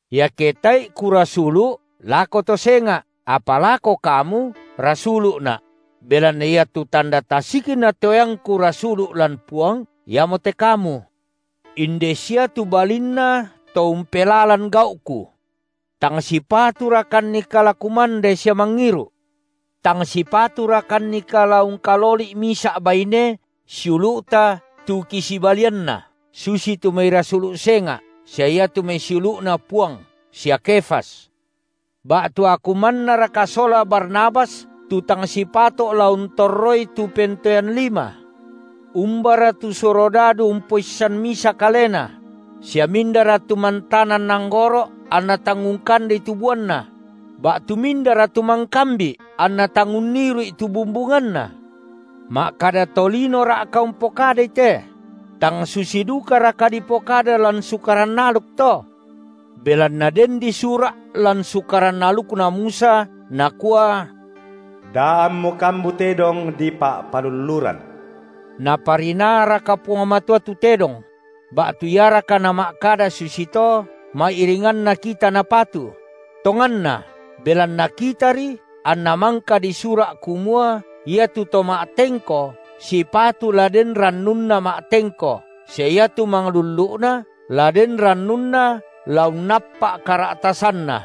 Iake tae’i kurasulu’ lako to senga’, apa lako kamu rasulu’na’; belanna iatu tanda tasikna toeangku rasulu’ lan Puang, iamote kamu. Inde sia tu balinna to umpelalan gau’ku. Tang sipaturakannika la kumande sia mangiru’? Tang sipaturakannika la ungkaloli’ misa’ baine siulu’ta tu kisibalianna, susitu mai rasulu’ senga’ sia iatu mai siulu’Na Puang sia Kefas? Ba’tu aku mannaraka sola Barnabas tu tang sipato’ la untorroi tu pentoean lima? Umbara tu surodadu umpoissan misa kalena? Sia mindara tu mantanan anggoro’ anna tang ungkandei tu buanna? Ba’tu mindara tu mangkambi’ anna tang unniru’i tu bumbunganna? Ma’kada tolinora’ka umpokadai te? Tang susi dukaraka dipokada lan Sukaran aluk to? Belanna den disura’ lan sukaran alukna Musa, nakua: Da ammu kambu tedong dipa’palulluran. Naparinaaraka Puang Matua tu tedong? Ba’tu iaraka Nama’kada susito, ma’iringanna kita napatu? Tonganna belanna kitari anna mangka disura’ kumua iatu to ma’tengko sipatu la den rannunna ma’tengko sia iatu manglullu’na la den rannuna la unnappa’ kara’tasanna.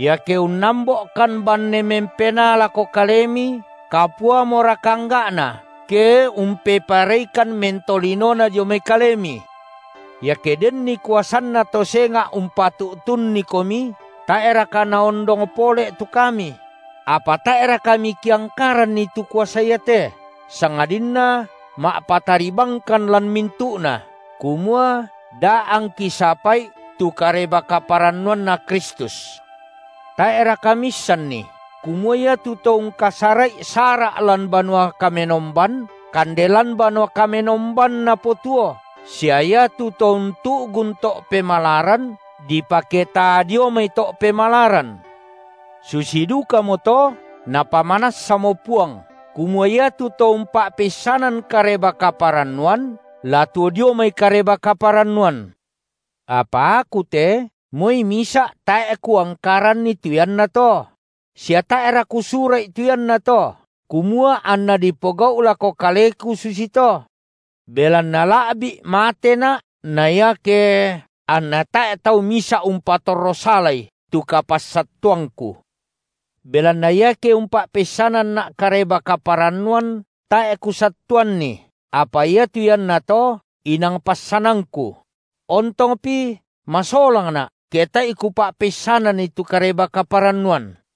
Iake unnambo’kan banne mempenaa lako kalemi, kapuamoraka angga’na, ke umpepareikan mentolinona dio mai kalemi? Iake denni kuasanna to senga’ umpa’tuntunnikomi, tae’raka naondong pole tu kami? Apa tae’ra kami kiangkaranni tu kuasa iate, sangadinna ma’patari bangkan lan mintu’na, kumua da angki sapa’i tu Kareba-kaparannuanNa Kristus. Tae’raka miissanni kumua iatu to ungkasara’i sara’ lan banua kamenomban, kande lan banua kamenomban napotuo sia iatu to untu’gun to’ pemalaran, dipaketaa dio mai to’ pemalaran? Susi dukamoto Napamanassamo Puang, kumua iatu to umpa’peissanan Kareba-kaparannuan, la tuo dio mai Kareba-kaparannuan. Apa aku te, moi misa’ tae’ kuangkaranni tu iannato; sia tae’ra kusura’i tu iannato, kumua anna dipogau’ lako kaleku susito. Belanna la’bi’ matena’ na iake …, anna tae’ tau misa’ umpatorro salai tu kapassattuangku. Belanna iake umpa’peissananna’ Kareba-kaparannuan, tae’ kusattuanni, apa iatu iannato inang passanangku; ontongpi masolangna’, ke tae’i kupa’peissananni tu Kareba-kaparannuan.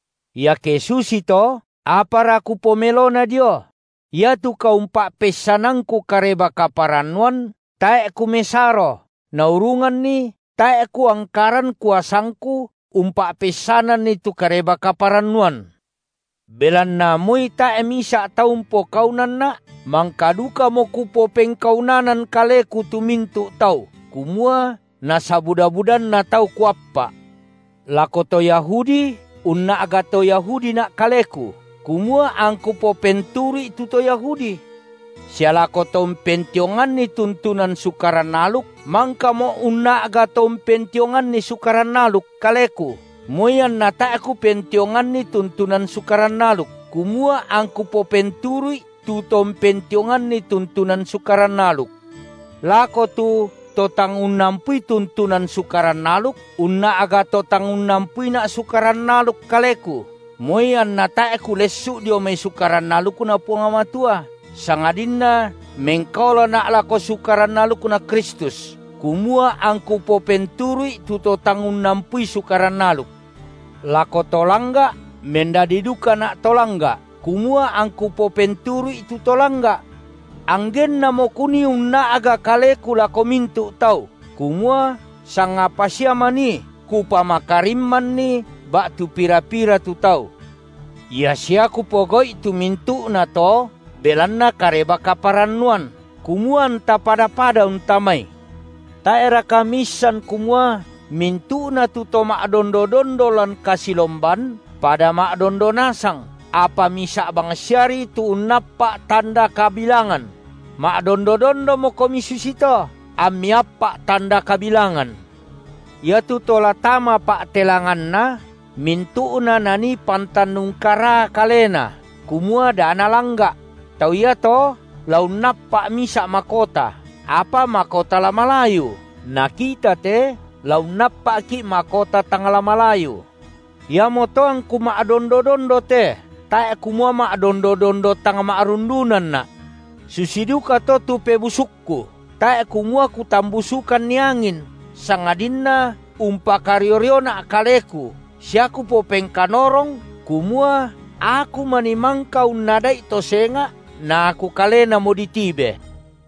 Iake susito, apara kupomelona dio? Iatu kaumpa’peissanangku Kareba-kaparannuan, tae’ kumesaro, naurunganni tae’ kuangkaran kuasangku umpa’peissananni tu Kareba-kaparannuan! Belanna moi tae’ misa’ tau umpokaunanna’, mangka dukamo kupopengkaunanan kaleku tu mintu’ tau, kumua nasabuda-budanna tau kuappa’. Lako to Yahudi unna’ga to Yahudina’ kaleku, kumua angku popenturu’i tu to Yahudi. Sia lako to umpentionganni tuntunan Sukaran aluk mangkamo’ unna’ga to umpentionganni Sukaran aluk kaleku, moi anna tae’ kupentionganni tuntunan Sukaran aluk, kumua angku popenturu’i tu to umpentionganni tuntunan Sukaran aluk. Lako tu to tang unnampui tuntunan Sukaran aluk, unna’ga to tang unnampuina’ Sukaran aluk kaleku, moi anna tae’ kulessu’ dio mai Sukaran alukNa Puang Matua, sangadinna mengkaolana’ lako Sukaran alukNa Kristus, kumua angku popenturu’i tu to tang unnampui Sukaran aluk. Lako to langga’ mendadi dukana’ to langga’, kumua angku popenturu’i tu to langga’. Anggennamo kunii unna’ga kaleku lako mintu’ tau, kumua sangapa sia manii kupamakarimmanni ba’tu pira-pira tu tau. Ia sia kupogau’i tu mintu’nato, belanna Kareba-kaparannuan, kumua anta pada-pada untamai. Tae’raka miissan kumua mintu’na tu to ma’dondo-dondo lan kasilomban, pada ma’dondo nasang, apa misa’ bangsiari tu unnappa’ tanda kabilangan? Ma’dondo-dondomokomi susito, ammi appa’ tanda kabilangan. Iatu to la tama pa’telanganna, mintu’na nanii pantan ungkaraa kalena kumua da nalangga’; tau iato la unnappa’ misa’ makota, apa makota la malayu, na kita te la unnappa’ki’ makota tang la malayu. Iamoto angku ma’dondo-dondo te, tae’ kumua ma’dondo-dondo tang ma’rundunanna’. Susi dukato tu pebusukku, tae’ kumua kutambusukanni angin, sangadinna umpakario-riona’ kaleku sia kupopengkanorong kumua aku manii mangka unnada’i to senga’ na aku kalenamo ditibe.